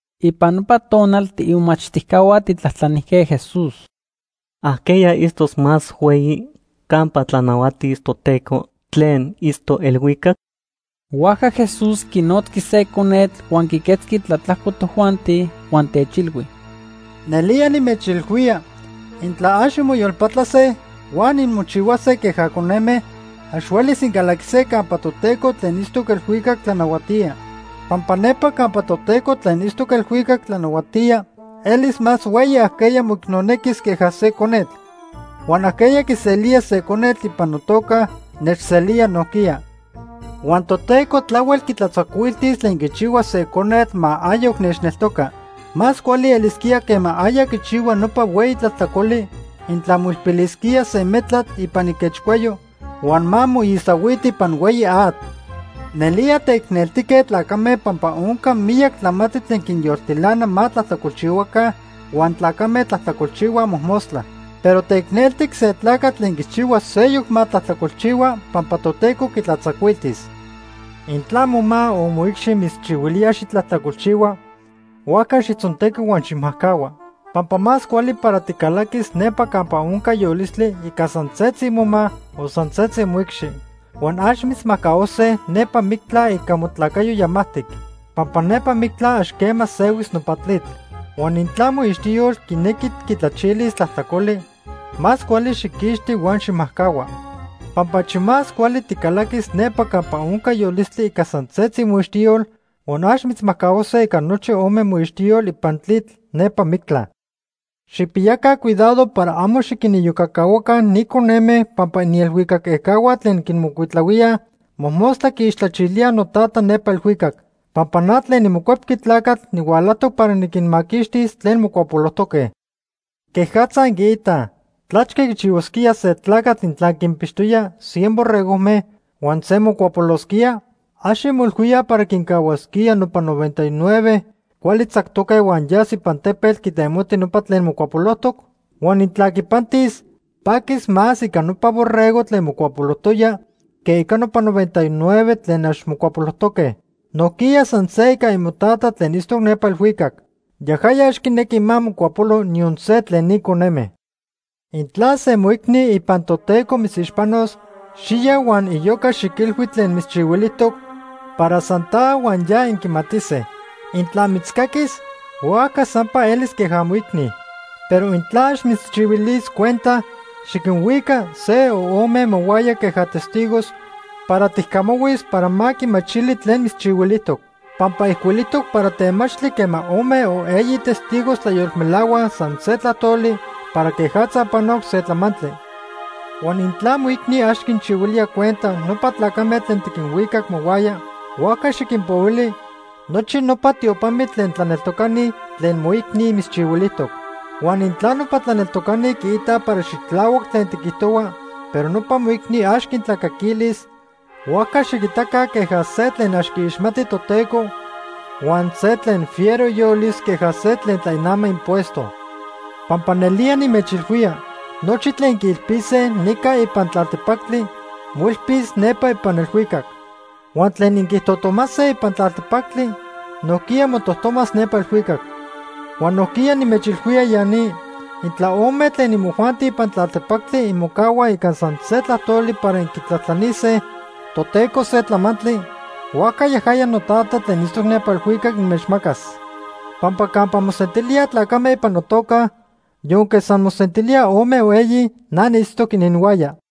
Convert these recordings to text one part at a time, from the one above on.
Ipan nopa tonal tiimomachtijcahua tijtlajtlanijque Jesús: ―¿Ajqueya itztos más hueyi campa tlanahuatis Toteco tlen itztoc elhuicac? Huajca Jesús quinotzqui se conetl huan quiquetzqui tlatlajco tojuanti, huan techilhui: ―Nelía nimechilhuía intla ax inmoyolpatlase huan inmochihuase queja coneme, ax huelis incalaquise campa Toteco tlen itztoc elhuicac tlanahuatía. Pampa nepa campa Toteco tlen itztoc elhuicac tlanahuatía elis más hueyi ajqueya moicnonequis queja se conetl. Huan ajqueya quiselía se conetl ipan notoca, nechselía nojquiya. “Huan Toteco tlahuel quitlatzacuiltis tlen quichihuas se conetl ma ayoc nechneltoca. Más cuali elisquía quema aya quichihua nopa hueyi tlajtlacoli, intla moilpilisquía se metlatl ipan iquechcuayo huan ma moisahuiti ipan hueyi atl. Nelía teicneltique tlacame pampa onca miyac tlamantli tlen quinyoltilana ma tlajtlacolchihuaca huan tlacame tlajtlacolchihuaj mojmostla. Pero teicneltic se tlacatl tlen quichihuilía seyoc ma tlajtlacolchihua pampa Toteco quitlatzacuiltis. “Intla moma o moicxi mitzchihuilía xitlajtlacolchihua, huajca xijtzontequi huan xijmajcahua. Pampa más cuali para ticalaquis nepa campa onca yolistli ica san setzi moma o san setzi moicxi, huan ax mitzmajcahuase nepa mictla ica motlacayo yamajtic. Pampa nepa mictla ax quema sehuis nopa tlitl. Huan intla moixtiyol quinequi quitlachilis tlajtlacoli, más cuali xijquixti huan xijmajcahua. Pampa achi más cuali ticalaquis nepa campa onca yolistli ica san setzi moixtiyol huan ax mitzmajcahuase ica nochi ome moixtiyol ipan tlitl nepa mictla. “Xijpiyaca cuidado para amo xiquiniyocacahuaca ni coneme pampa inielhuicac ejcahua tlen quinmocuitlahuíaj, mojmostla quiixtlachilíaj noTata nepa elhuicac. Pampa na tlen niMocuepqui Tlacatl nihualajtoc para niquinmaquixtis tlen mocuapolojtoque. “¿Quejatza inquiitaj? ¿Tlachque quichihuasquía se tlacatl intla quinpixtoya cien borregojme huan se mocuapolosquía? ¿Ax inmoilhuíaj para quincahuasquía nopa noventa y nueve cuali tzactoque huan yas ipan tepetl quitemoti nopa tlen mocuapolojtoc? Huan intla quipantis, paquis más ica nopa borrego tlen mocuapolojtoya que ica nopa noventa y nueve tlen ax mocuapolojtoque. Nojquiya san se ica imoTata tlen itztoc nepa elhuicac. Yajaya ax quinequi ma mocuapolo niyon se tlen ni coneme. “Intla se moicni ipan Toteco mitzixpano, xiya huan iyoca xiquilhui tlen mitzchihuilijtoc para san ta huan ya inquimatise. Intla mitzcaquis huajca sampa elis queja moicni. Pero intla ax mitzchihuilis cuenta, xiquinhuica se o ome mohuaya queja testigos para tijcamahuis para ma quimachili tlen mitzchihuilijtoc. Pampa ijcuilijtoc para temachtli quema ome o eyi testigos tlayolmelahuaj san se tlajtoli para quejatza panoc se tlamantli. Huan intla moicni ax quinchihuilía cuenta nopa tlacame tlen tiquinhuicac mohuaya, huajca xiquinpohuili nochi nopa tiopamitl tlen tlaneltocani tlen moicni mitzchihuilijtoc. Huan intla nopa tlaneltocani quiitaj para xitlahuac tlen tiquijtohua pero nopa moicni ax quintlacaquilis, huajca xiquitaca queja se tlen ax quiixmati Toteco huan se tlen fiero iyolis queja se tlen tlainama impuesto. “Pampa nelía nimechilhuía, nochi tlen inquiilpise nica ipan tlaltepactli, moilpis nepa ipan elhuicac. Huan tlen inquitojtomase ipan tlaltepactli nojquiya motojtomas nepa elhuicac. “Huan nojquiya nimechilhuía ya ni, intla ome tlen imojuanti ipan tlaltepactli inmocahuaj ica san se tlajtoli para inquitlajtlanise Toteco se tlamantli, huajca yajaya noTata tlen itztoc nepa elhuicac inmechmacas. Pampa campa mosentilíaj tlacame ipan notoca, yonque san mosentilíaj ome o eyi, na niitztoc ininhuaya.”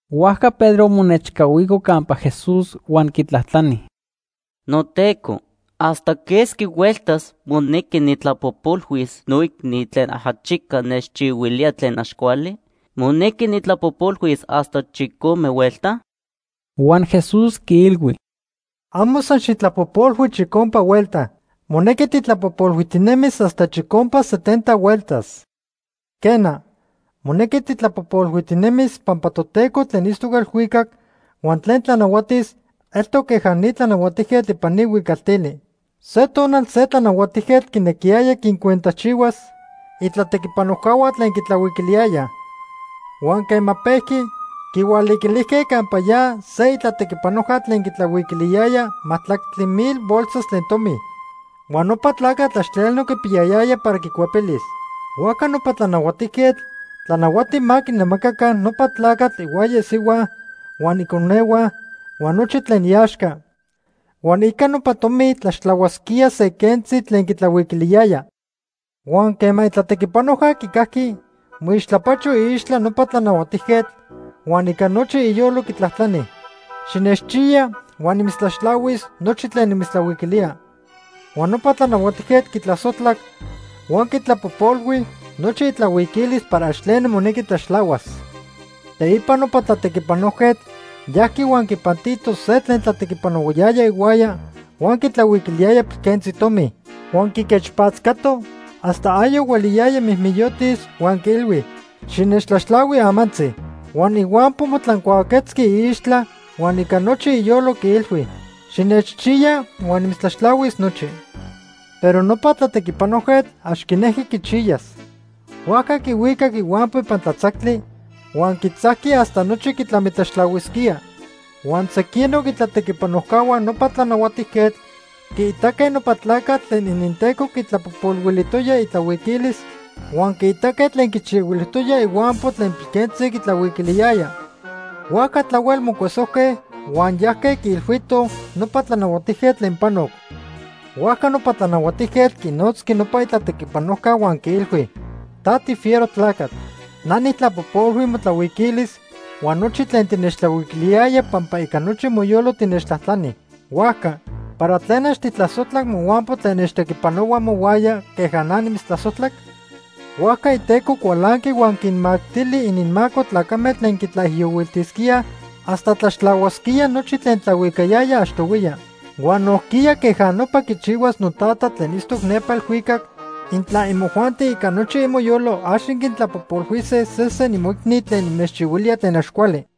Huajca Pedro monechcahuico campa Jesús huan quitlajtlani: ―NoTeco, ¿hasta quesqui hueltas monequi nijtlapojpolhuis noicni tlen ajachica nechchihuilía tlen ax cuali? ¿Monequi nijtlapojpolhuis hasta chicome huelta? Huan Jesús quiilhui: ―Amo san xijtlapojpolhui chicompa huelta. Monequi tijtlapojpolhuijtinemis hasta chicompa setenta hueltas. “Quena, monequi tijtlapojpolhuijtinemis pampa Toteco tlen itztoc elhuicac huan tlen tlanahuatis eltoc queja ni tlanahuatijquetl ipan ni huicaltili. Se tonal se tlanahuatijquetl quinequiyaya quincuentajchihuas itlatequipanojcahua tlen quitlahuiquiliyayaj. Huan quema pejqui, quihualiquilijque campa ya se itlatequipanojca tlen quitlahuiquiliyaya majtlactli mil bolsas tlen tomi. Huan nopa tlacatl ax tleno quipiyayaya para quicuepilis. Huajca nopa tlanahuatijquetl tlanahuati ma quinamacaca nopa tlacatl ihuaya isihua huan iconehua huan nochi tlen iaxca, huan ica nopa tomi tlaxtlahuasquía se quentzi tlen quitlahuiquiliyaya. “Huan quema itlatequipanojca quicajqui, moixtlapacho iixtla nopa tlanahuatijquetl huan ica nochi iyolo quitlajtlani: ‘Xinechchiya huan nimitztlaxtlahuis nochi tlen nimitztlahuiquilía.’ Huan nopa tlanahuatijquetl quitlasojtlac huan quitlapojpolhui nochi itlahuiquilis para ax tleno monequi tlaxtlahuas. “Teipa nopa tlatequipanojquetl yajqui huan quipantito se tlen tlatequipanohuayaya ihuaya huan quitlahuiquiliyaya pilquentzi tomi. Huan quiquechpatzcato hasta ayoc hueliyaya mijmijyotis huan quiilhui: ‘Xinechtlaxtlahui amantzi.’ “Huan ihuampo motlancuaquetzqui iixtla huan ica nochi iyolo quiilhui: ‘Xinechchiya huan nimitztlaxtlahuis nochi.’ “Pero nopa tlatequipanojquetl ax quinejqui quichiyas. Huajca quihuicac ihuampo ipan tlatzactli huan quitzajqui hasta nochi quitlamitlaxtlahuisquía. Huan sequinoc itlatequipanojcahua nopa tlanahuatijquetl quiitaque nopa tlacatl tlen ininteco quitlapojpolhuilijtoya itlahuiquilis huan quiitaque tlen quichihuilijtoya ihuampo tlen pilquentzi quitlahuiquiliyaya. Huajca tlahuel mocuesojque huan yajque quiilhuitoj nopa tlanahuatijquetl tlen panoc. “Huajca nopa tlanahuatijquetl quinotzqui nopa itlatequipanojca huan quiilhui: ‘Ta tifiero tlacatl. Na nijtlapojpolhui motlahuiquilis huan nochi tlen tinechtlahuiquiliyaya pampa ica nochi moyolo tinechtlajtlani. Huajca ¿para tlen ax tijtlasojtlac mohuampo tlen nechtequipanohua mohuaya queja na nimitztlasojtlac?’ Huajca iteco cualanqui huan quinmactili ininmaco tlacame tlen quitlaijiyohuiltisquíaj hasta tlaxtlahuasquía nochi tlen tlahuicayaya achtohuiya. Huan nojquiya queja nopa quichihuas noTata tlen itztoc nepa elhuicac intla imojuanti ica nochi imoyolo ax inquintlapojpolhuise sesen imoicni tlen inmechchihuilíaj tlen ax cuali.”